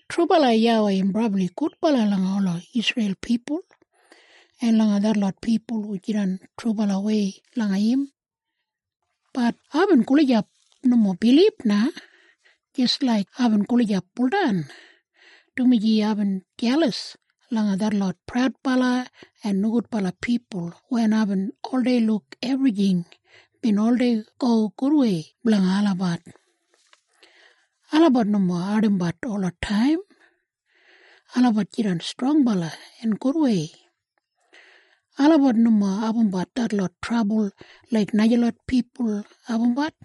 Trubala YAWEI im brabli gudbala langa ola Isreil pipul, en langa detlot pipul hu jidan trubalawei langa im. Bat aibin gulijap nomo bilib na, jis laik aibin gulijap buldan, dumaji aibin jelas langa detlot praudbala en nogudbala pipul wen aibin oldei luk ebrijing bin oldei go gudwei blanga olabat. Olabat nomo ardimbat olataim. Olabat jidan strongbala en gudwei. Olabat nomo abumbat detlot trabul laik najalot pipul abumbat.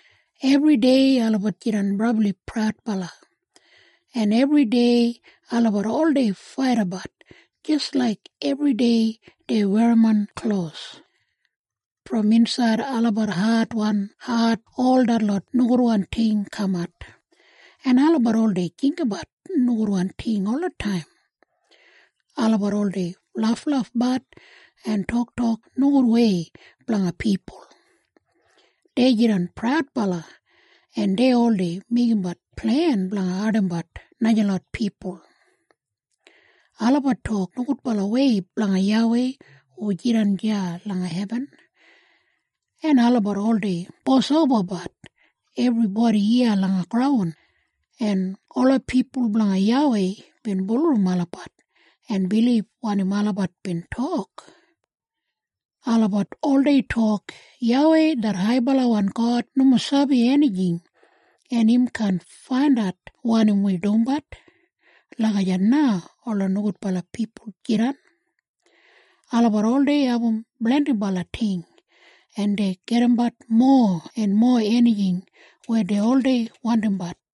Ebridei olabat jidan brabli praudbala, en ebridei olabat oldei faitabat jis laik ebridei dei werrimon klos. Brom insaid olabat adwan hat ol detlot nogudwan ting kamat, en olabat oldei jinggabat nogudwan ting olataim. Olabat oldei laflafbat en toktok nogudwei blanga pipul. Dei jidan praudbala en dei oldei meigimbat plen blanga ardimbat najalot pipul. Olabat tok nogudbalawei blanga YAWEI hu jidan deya langa hebin. En olabat oldei bosobabat ebribodi iya langa graun, en ola pipul blanga YAWEI bin bulurrum olabat, en bilib wanim olabat bin tok. Olabat oldei tok, “YAWEI det Haibalawan God nomo sabi enijing en im kaan faindat wanim wi dumbat.” Lagijat na ola nogudbala pipul jidan. Olabat oldei abum blendibala ting, en dei gedimbat mowa en mowa enijing weya dei oldei wandimbat.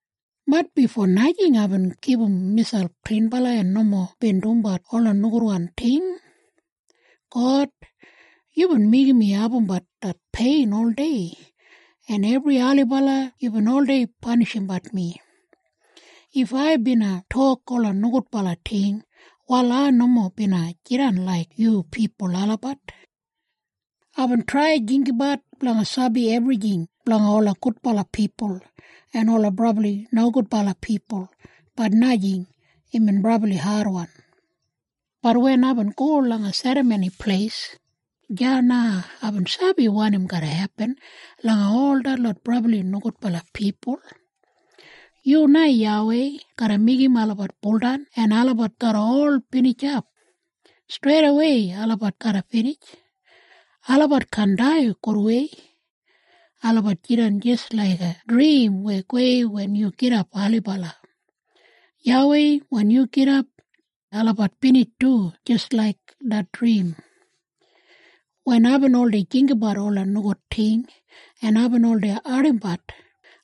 Maitbi fo najing aibin kipum miselp klinbala en nomo bin dumbat ola nogudwan ting. God, yubin meigim mi abumbat det pein oldei, en ebri ailibala yubin oldei panishimbat mi. If ai bina tok ola nogudbala ting, wal ai nomo bina jidan laik yu pipul olabat. Aibin trai jinggabat blanga sabi ebrijing blanga ola gudbala pipul en ola brabli nogudbala pipul, bat najing. Imbin brabli adwan. Bat wen aibin go langa yu Serramoni Pleis, deya na aibin sabi wanim garra hepin langa ol detlot brabli nogudbala pipul. Yu na YAWEI garra meigim olabat buldan en olabat garra ol binijap. Streidawei olabat garra binij. Olabat kaan dai gudwei. Olabat jidan jis laiga drim weya gowei wen yu gidap ailibala. YAWEI wen yu gidap, olabat binij du, jis laik det drim. Wen aibin oldei jinggabat ola nogud ting, en aibin oldei ardimbat,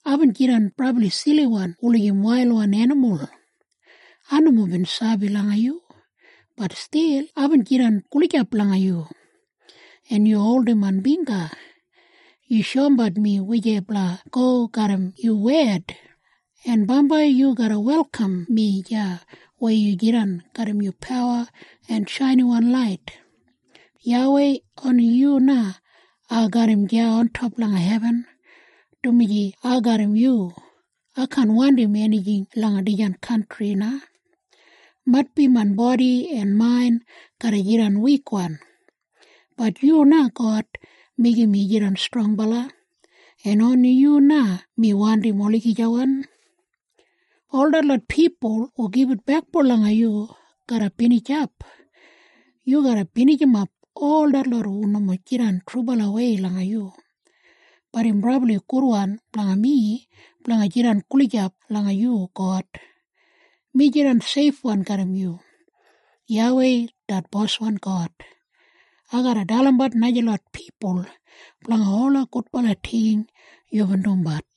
aibin jidan brabli siliwan wulijim wailwan enimul. Ai nomo bin sabi langa yu. Bat stil aibin jidan gulijap langa yu, en yu holdim main bingga. Yu shoumbat mi wujei blanga go garram yu wed, en bambai yu garra welkam mi deya weya yu jidan garram yu pawa en shainiwan lait. YAWEI, oni yu na ai garram deya ontop langa hebin. Dumaji ai garram yu, ai kaan wandim enijing langa dijan kantri na. Maitbi main bodi en main garra jidan wikwan, bat yu na God meigim mi jidan strongbala, en oni yu na mi wandim olagijawan. Ol detlot pipul hu gibit bekboun langa yu garra binijap. Yu garra binijimap ol detlot hu nomo jidan trubalawei langa yu. Bat im brabli gudwan blanga mi blanga jidan gulijap langa yu God. Mi jidan seifwan garram yu, YAWEI det boswan God. Ai garra dalimbat najalot pipul blanga ola gudbala ting yubin dumbat.